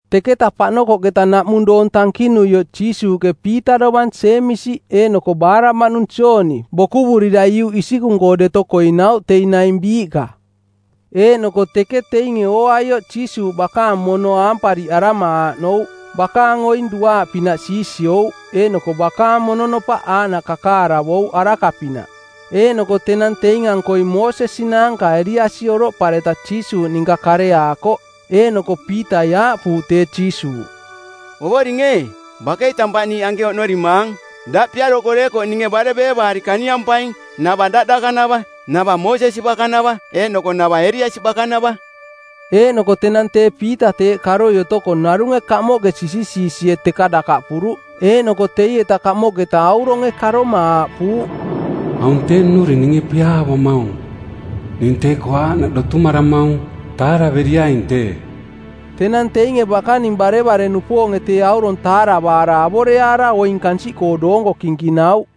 Teketa paꞌnokoꞌketa naꞌmung doong tankinuioꞌ Jiisuuꞌke Piita dovang Jeemisi eeꞌnoko baaraꞌmaꞌnung Jooni, bokuvurira iuꞌ isikung-koo deto koinauꞌ teing naing biiꞌka. Eeꞌnoko teke teinge ooaioꞌ Jiisuuꞌ bakaang mono aampariꞌarama aaꞌnouꞌ, bakaang oing duaaꞌpinaꞌ siisiouꞌ eeꞌnoko bakaang mononopaꞌ aaꞌnaꞌ kakaaravouꞌ araka-pinaꞌ. Eeꞌnoko tenang teing-ankoi Moosesi naanka Eliasi oroꞌpareta Jiisuuꞌ ninka kareaakoꞌ. Eeꞌnoko Piitai aaꞌpuuꞌ tee Jiisuuꞌ, “Ovoring ee, bakei tampaꞌ niiꞌ anke oꞌnorimaang. Daꞌ piaroko deekoꞌ ninge bare beevaari kaniampaing, nava daꞌ dakanava, nava Moosesi bakanava eeꞌnoko nava Eliasi bakanava.” Eeꞌnoko tenang tee Piita teeꞌ karoi otoko narunge kamoꞌke sisisiisie teka dakaꞌpuruꞌ, eeꞌnoko teieta kamoꞌketa auronge karoma aaꞌpuuꞌ, “Aung tee nnuring ninge piaavamaung. Ning tee-koo aaꞌnaꞌ dotumaramaung. Taaraveriaing tee.” Tenang teinge bakaning barevare-nupoonge tee aurong taaravaara avoreaara oing kansiꞌkoo doonko kinkinauꞌ.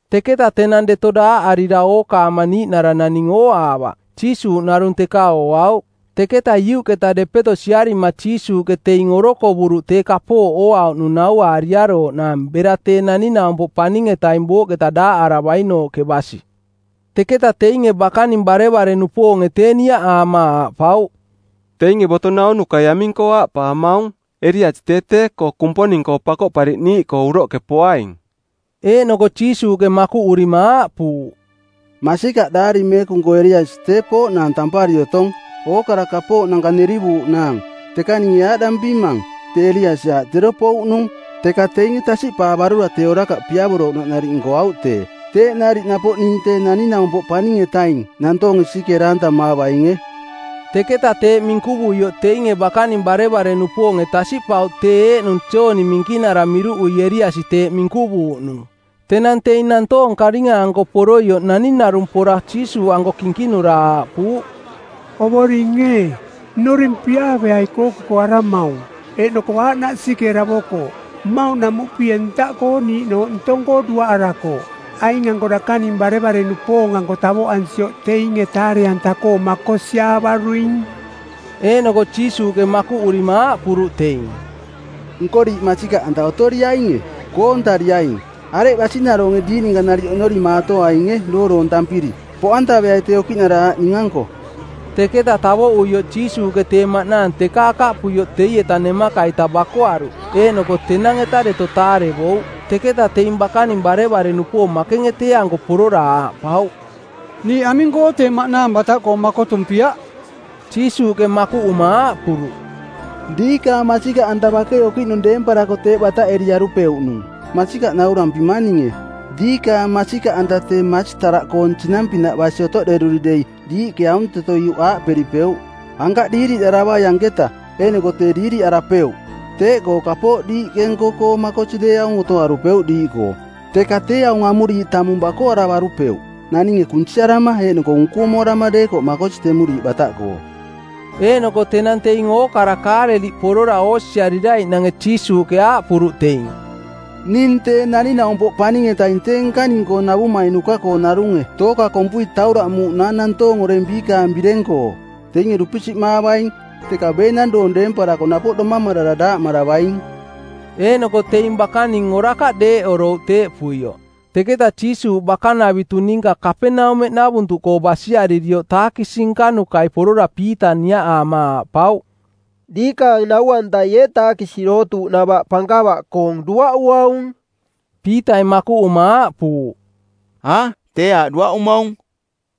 Teketa tenang deto daaꞌarira ookaama niiꞌnara naning ooaavaꞌ, Jiisuuꞌ narung teka ooauꞌ. Teketa iuꞌketa depeto siarima Jiisuuꞌke teing orokovuruꞌ tee kapooꞌ ooauꞌnung nauaariarooꞌnaang bera tee Naning-naumpoꞌ Paning-etaing booꞌketa daaꞌaravainooꞌke basi. Teketa teinge bakaning barevare-nupoonge tee niaꞌaama aaꞌpauꞌ, “Teinge boto naunukai aming-koo aaꞌpaamaung Eliasi tee tee-koo Kumponinge Pakoꞌpariꞌniiꞌkoo˜ uroꞌke poaing?” Eeꞌnoko Jiisuuꞌke makuꞌurima aaꞌpuuꞌ, “Masikaꞌ Daari Meekung-koo Eliasi tee pooꞌnaang tampari otong ookara kapooꞌnanka nerivuuꞌnaang. Teka ninge aaꞌdampimang, tee Eliasi aaꞌ tee tero pouꞌnung, teka teinge tasiꞌpaavarura tee orakaꞌ piavorouꞌnaꞌ nariꞌ nkoauꞌ tee. Teeꞌ nariꞌ napoꞌ ning Tee Naning-naumpoꞌ Paning-etaing nantoonge sisikeera-antamaavainge.” Teketa teeꞌ minkuvuioꞌ teinge bakaning barevare-nupoonge tasiꞌpauꞌ tee eeꞌnung Jooni Minkinara miruꞌui Eliasi teeꞌ minkuvuuꞌnung. Tenang teing nantoong karinga-anko poroioꞌ naning narung pora Jiisuuꞌanko kinkinura aaꞌpuuꞌ, “Ovoring ee, nnuring piaaveai kookokoaramaung, eeꞌnoko aaꞌnaꞌ sisikeeravokooꞌ. Mmauꞌnamuꞌpie ntaꞌkoo niiꞌnooꞌ ntong-koo duaꞌarakooꞌ. Aing-anko dakaning barevare-nupoong-anko tavoꞌansioꞌ teinge taare-anta-koo makosiaavaruing.” Eeꞌnoko Jiisuuꞌke makuꞌurima aaꞌpuruꞌ teing, “Nko diiꞌ masikaꞌanta otoriainge, koontariaing, areꞌ basinaroonge diiꞌ ninka nariꞌ oꞌnorimaatoainge dooroontampiri? Poꞌantaveai tee okiꞌnara aꞌ ning-anko.” Teketa tavoꞌuioꞌ Jiisuuꞌke tee maꞌnaang teka akaꞌpuioꞌ teieta nemaka-ita bakoaruꞌ, eeꞌnoko tenang-eta deto taarevouꞌ. Teketa teing bakaning barevare-nupoong makenge tee-anko porora aaꞌpauꞌ, “Niiꞌ aming-koo tee maꞌnaang bataꞌkoo makotumpiaꞌ?” Jiisuuꞌke makuꞌuma aaꞌpuruꞌ, “Diikaang masikaꞌanta bakei okiꞌnung deemparako teeꞌ bataꞌeriarupeuꞌnung. Masikaꞌ naurampimang ninge, diikaang masikaꞌanta tee masitaraꞌkoong sinang-pinaꞌ basi otoꞌderui dei diiꞌke aunteto iuꞌ aaꞌperipeuꞌ, ‘Ankaꞌ diiriꞌdaravai anketa,’ eeꞌnoko tee diiriꞌarapeuꞌ. Teeꞌkoo kapooꞌ diiꞌke nko-koo makosi deeaung otoarupeuꞌ diiꞌkoo. Teka tee aung amuriiꞌ tamung bakoaravarupeuꞌ, naninge kunsiarama eeꞌnoko unkumoarama deekoꞌ makosi temuriiꞌ bataꞌkoo.” Eeꞌnoko tenang teing ookara Kaaleliꞌ porora oosiariraiꞌnange Jiisuuꞌke aaꞌpuruꞌ teing, “Ning Tee Naning-naumpoꞌ Paning-etaing tee nkaning-koo navumainuka-koo narunge tooka kompui tauraꞌmuuꞌnaang nantoong oreng biikaang bireng-koo. Teinge dupisiꞌmaavaing, teka beenang doong deemparako napoꞌ domamarara daaꞌmaravaing.” Eeꞌnoko teing bakaning orakaꞌ deeꞌorouꞌ teeꞌpuioꞌ. Teketa Jiisuuꞌ bakanavitu ninka Kapaneumeꞌnavuntuꞌkoo basiaririoꞌ taakisi nkanukai porora Piita niaꞌaama aaꞌpauꞌ, “Diikaang nau-antai ee taakisi dootuuꞌnava pankava-koong duaꞌuaung?” Piitai makuꞌuma aaꞌpuuꞌ, “A, tee aaꞌ duaꞌumaung.”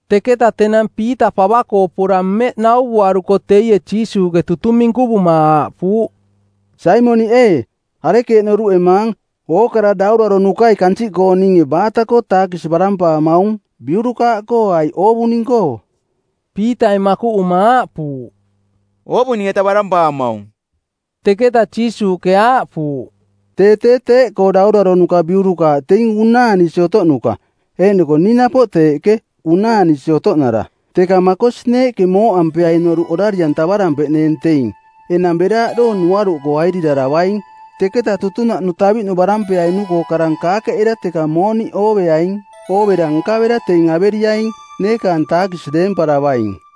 Teketa tenang Piita pava-koo pora mmeꞌ nauvuaruko teie Jiisuuꞌke tutung minkuvuma aaꞌpuuꞌ, “Saimoniꞌ ee, arekeeꞌ noruꞌemaang, ookara dauraronukai kansiꞌkooninge baata-koo taakisi barampaamaung, biurukaaꞌkoo aiꞌ oovuning-koo?” Piitai makuꞌuma aaꞌpuuꞌ, “Oovuning-eta barampaamaung.” Teketa Jiisuuꞌke aaꞌpuuꞌ, “Tee tee teeꞌkoo dauraronuka biurukaaꞌ teing unaanisi otoꞌnuka, eeꞌnoko ning napoꞌ teeꞌke, unaanisi otoꞌnara. Teka makosi neeꞌke mooꞌampeaing noruꞌ orari-antavarampeꞌneeng teing. Enang bera aꞌdoong nuaruꞌkoo airiraravaing, teketa tutunaꞌnu taviꞌnu barampeainu-koo karang kaakeꞌera teka mooniꞌ ooveaing. Oovera nkavera teing averiaing, neekaang taakisi deemparavaing.”